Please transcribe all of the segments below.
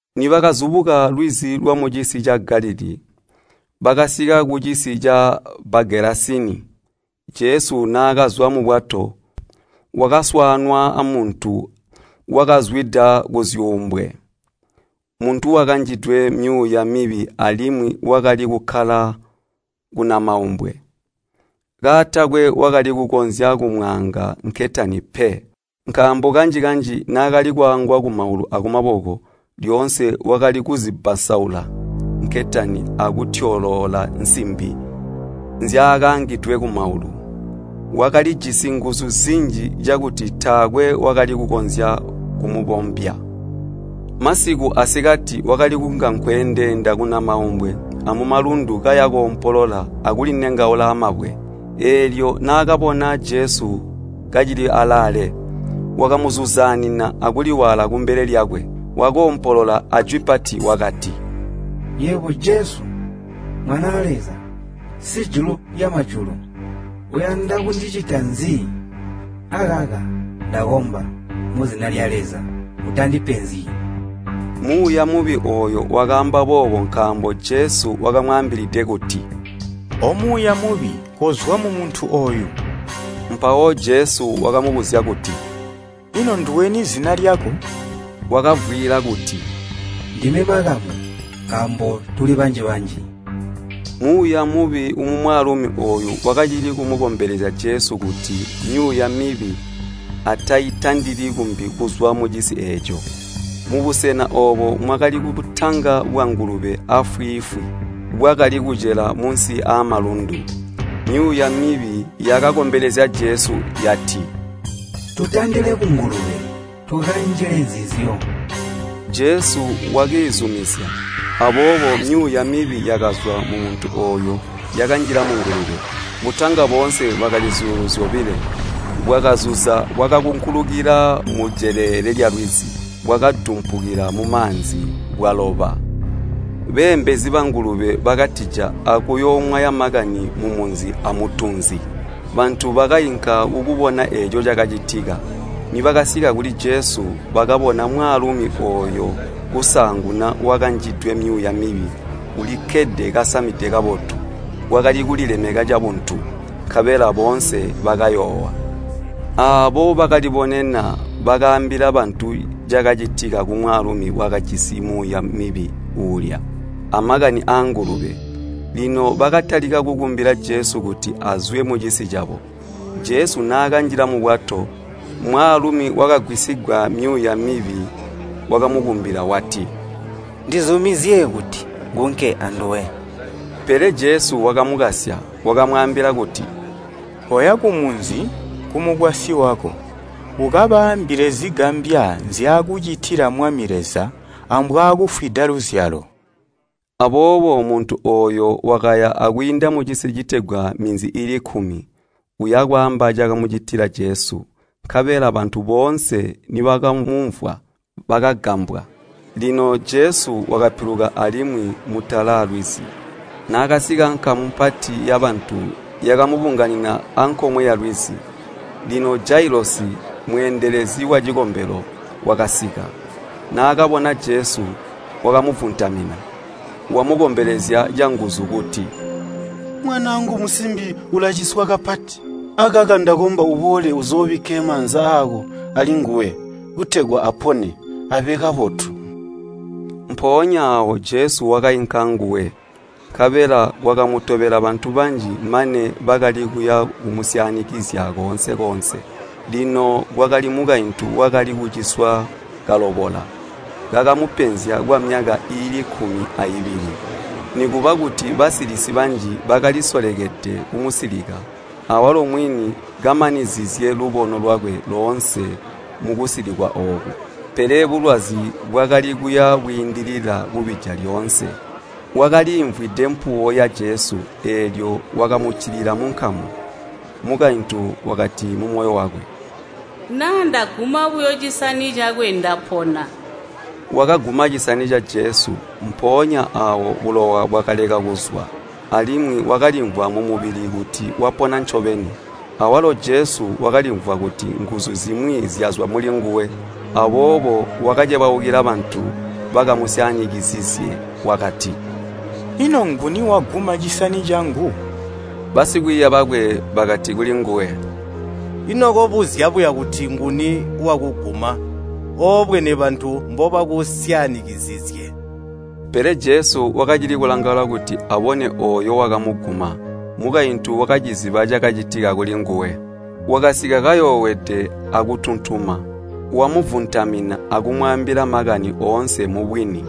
Nibakazubuka lwizi lwamucisi ca Galilii, bakasika kucisi ca Bagelasini, Jesu naakazwa mubwato, wakaswaanwa amuntu wakazwida kuzyuumbwe. Muntu wakanjidwe myuuya mibi alimwi wakali kukkala kunamaumbwe. Kaatakwe wakali kukonzya kumwaanga nketani pe. Nkaambo kanji-kanji naakali kwaangwa kumaulu akumaboko, lyoonse wakali kuzibbansaula nketani akutyoloola nsimbi nzyaakaangidwe kumaulu. Wakalijisi nguzu zinji cakuti taakwe wakali kukonzya kumubombya. Masiku asikati wakali kunga nkweendeenda kunamaumbwe amumalundu kaya boompolola akulinengaula amabwe. Eelyo naakabona Jesu kacili alaale, wakamuzuzaanina akuliwaala kumbele lyakwe, wakoompolola ajwi pati wakati, “Yebo Jesu, Mwanaa Leza, Sijulu lyamajulu! Uyanda kundicita nzi? Akaka ndakomba muzina lya Leza, utandipenzyi!” Muuya mubi ooyo wakaamba boobo nkaambo Jesu wakamwaambilide kuti, “Omuuya mubi, kozwa mumuntu ooyu!” Mpawo Jesu wakamubuzya kuti, “Ino nduweni zina lyako?” Wakavwiila kuti, “Ndime ‘Makamu’ nkaambo tuli banji-banji!” Muuya mubi mumwaalumi ooyu wakacili kumukombelezya Jesu kuti myuuya mibi ataitandili kumbi kuzwa mucisi eeco. Mubusena oobo mwakali butanga bwangulube aafwiifwi, bwakali kucela munsi aamalundu. Myuuya mibi yakakombelezya Jesu yati, “Tutandile kungulube tukanjile nzizyo.” Jesu wakiizumizya. Aboobo myuuya mibi yakazwa mumuntu ooyo yakanjila mungulube. Butanga boonse bwakali zyuulu zyobilo, bwakazuza bwakakunkulukila mujelele lyalwizi, bwakadumpukila mumaanzi, bwaloba. Beembezi bangulube bakatija akuyoomwaya makani mumunzi amutunzi. Bantu bakainka kukubona eeco cakacitika. Nibakasika kuli Jesu, bakabona mwaalumi ooyo kusaanguna wakanjidwe myuuya mibi ulikkede kasamide kabotu, wakali kulilemeka cabuntu, nkabela boonse bakayoowa. Aabo bakalibonena bakaambila bantu cakacitika kumwaalumi wakajisi wamyuuya mibi uulya, amakani aangulube. Lino bakatalika kukumbila Jesu kuti azwe mucisi cabo. Jesu naakanjila mubwato, mwaalumi wakagwisigwa myuuya mibi wakamukumbila wati, “Ndizumizye kuti ngunke anduwe!” Pele Jesu wakamukasya. Wakamwaambila kuti, “Koya kumunzi, kumukwasyi wako, ukabaambile zigambya nzyaakucitila Mwami Leza, ambwaakufwida luzyalo!” Aboobo muntu ooyo wakaya akwiinda mucisi citegwa Minzi iili kkumi, uya bwaamba ncaakamucitila Jesu. Nkabela bantu boonse nibakamumvwa bakagambwa. Lino Jesu wakapiluka alimwi mutala lwizi. Naakasika nkamu mpati yabantu yakamubunganina ankomwe yalwizi. Lino Jailosi, mweendelezi wacikombelo, wakasika, naakabona Jesu, wakamuvuntamina. Wamukombelezya canguzu kuti, “Mwanaangu musimbi ulaciswa kapati. Akaka ndakomba uboole uzoobikke maanza aako alinguwe, kutegwa apone, abe kabotu.” Mpoonya aawo Jesu wakainka anguwe. Nkabela kwakamutobela bantu banji mane bakali kuya bumusyaanikizya koonse-koonse. Lino kwakali mukaintu wakali kuciswa kalobola, kakamupenzya kwamyaka iili kkumi aibili. Nikuba kuti basilisi banji bakalisolekede kumusilika, awalo mwini kamanizizye lubono lwakwe loonse mukusilikwa ooku, pele bulwazi bwakali kuya bwiindilila kubija lyoonse. Wakaliimvwide mpuwo ya Jesu, eelyo wakamuccilila munkamu. Mukaintu wakati mumoyo wakwe, “Naa ndaguma buyo cisani cakwe ndapona.” Wakaguma cisani ca Jesu, mpoonya aawo bulowa bwakaleka kuzwa, alimwi wakalimvwa mumubili kuti wapona ncobeni. Awalo Jesu wakalimvwa kuti nguzu zimwi zyazwa mulinguwe. Aboobo wakacebaukila bantu bakamusyaanikizizye wakati, “Ino nguni waguma cisani cangu?” Basikwiiya bakwe bakati kulinguwe, “Ino kobuzya buya kuti nguni wakuguma, oobwene bantu mbobakusyaanikizizye?” Pele Jesu wakacili kulangaula kuti abone ooyo wakamuguma. Mukaintu wakaciziba cakacitika kulinguwe, wakasika kayoowede akutuntuma, wamuvuntamina, akumwaambila makani oonse mubwini.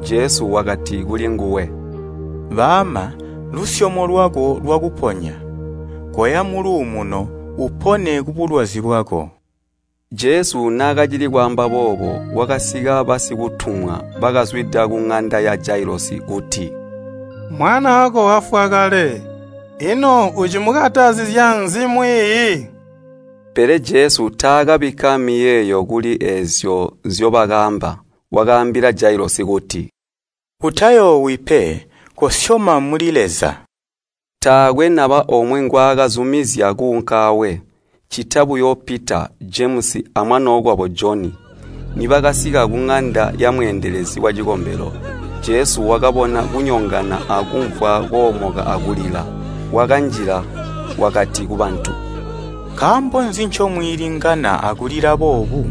Jesu wakati kulinguwe, “Baama, lusyomo lwako lwakuponya. Koya muluumuno, upone kubulwazi bwako.” Jesu naakacili kwaamba boobo Jesu, kwakasika basikutumwa bakazwida kuŋanda ya Jailosi kuti, “Mwanaako wafwa kale. Ino ucimukatazizya nzi Mwiiyi?” Pele Jesu taakabikka miyeeyo kuli eezyo nzyobakaamba, wakaambila Jailosi kuti, “Utayoowi pe, kosyoma muli Leza.” Taakwe naba omwe ngwaakazumizya kuunka aawe, ccita buyo Pita, Jemusi amwanookwabo Joni. Nibakasika kuŋanda yamweendelezi wacikombelo, Jesu wakabona kunyongana akumvwa koomoka akulila. Wakanjila, wakati kubantu, “Nkaambo nzi ncomwiilingana akulila boobu?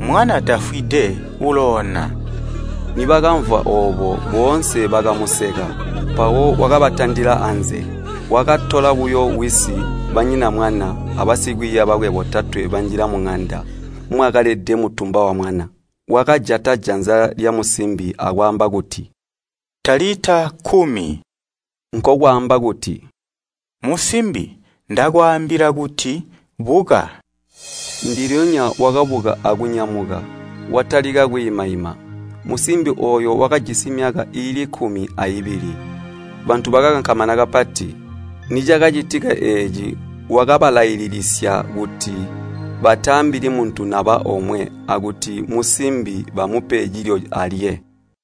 Mwana tafwide, uloona!” Nibakamvwa oobo, boonse bakamuseka, mpawo wakabatandila anze. Wakatola buyo wisi, banyina mwana, abasikwiiya bakwe botatwe banjila muŋanda mwakalede mutumba wamwana. Wakajata janza lyamusimbi akwaamba kuti, “Talita, kkumi,” nkokwamba kuti, “Musimbi! ndakwaambila kuti, buka!” Ndilyonya wakabuka akunyamuka, watalika kwiimaima. (Musimbi ooyo wakajisi myaka iili kkumi aibili.) Bantu bakakankamana kapati. Nicakacitika eeci wakabalailisisya kuti bataambili muntu naba omwe, akuti musimbi bamupe cilyo alye.